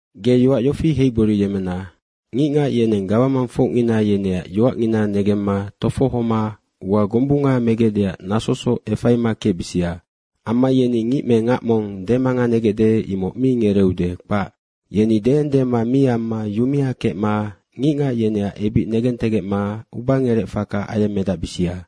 Ge yoac yofi heigboriyemmena, ngicngac yeneng gawamangfocngina yeneac yoacngina negemma tofohoma ua gombunga megecdeac nasosoc efaima kecbisia. Amma yeni ngic me ngac mong demanganegecde, imoc mi ngereeude, kpac. Yeni deendema mi amma yumea kecma ngicngac yeneac ebic negentegecma ubangerec faka ayemmedacbisia.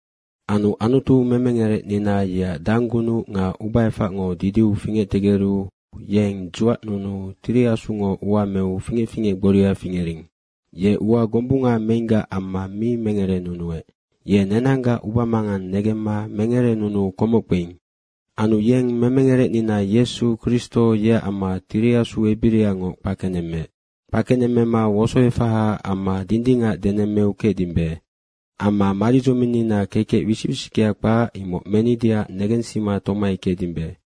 Anu Anutu memengerecnina, yeac danggunuc nga ubaefacngo didiu fingectegeru yeng dzuacnunuu Tiri Asungo ua meu fingec fingec gboria fingering. Ye ua gombunga meinggac amma mi mengerenunuec. Ye nenanggac ubamangang negemma mengerenunuu komoc kpeing. Anu yeng memengerecnina Yesu Kristo yeac amma Tiri Asu ebiriangoc kpakenemmeec. Kpakenemmema wosoefahaac amma dindingac denemmeu kecdimbe. Amma maridzominnina kekec wisic wisickea kpac, imoc menideac negensima tomai kecdimbe.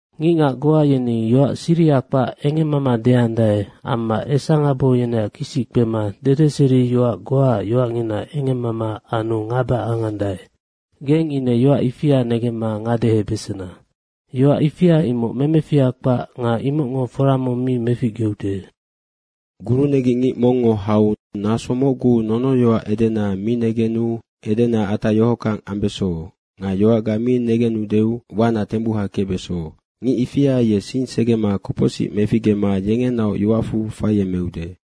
Ngicngac goa yeni yoac siriha kpac engemmama deandae amma esangabo yeneac kisic kpema dedeseriac yoac goaac yoacngina engemmama anu ngaba angandae. Geng ine yoac ifia negemma ngadehebesena. Yoac ifia imoc memefiha kpac nga imocngo fora mong mi meficgeude. Gurunegic ngic mongngo hau naso mocgu nonoyoac edena mi negenu edena atac yohockang ambeso nga yoacga mi negenudeu wana tembuha kecbeso. Ngic ifia ye sing segema kopocsic meficgema yengenaoc yoacfu faiemeude.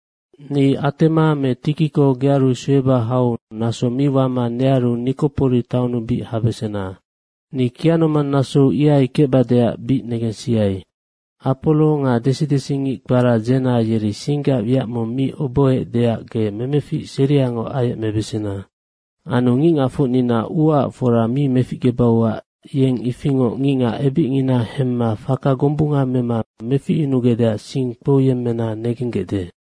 Ni Atema me Tikiko gearu sueba hau naso mi wama nearu Nikopori taonnu bic habesena. Ni kianomang nasou ihai kecbadeac bic negensiai. Aporo nga desi desi ngic kpara Dzena yeri singgac wiac mong mi obohoecdeac ge memefic seriangoc ayecmebesena. Anu ngicngacfocnina uaac fora mi meficgebauac yeneng ifingoc ngicngac ebicngina hemma faka gombunga mema meficyunugecdeac sing kpouyemmena negenggecde.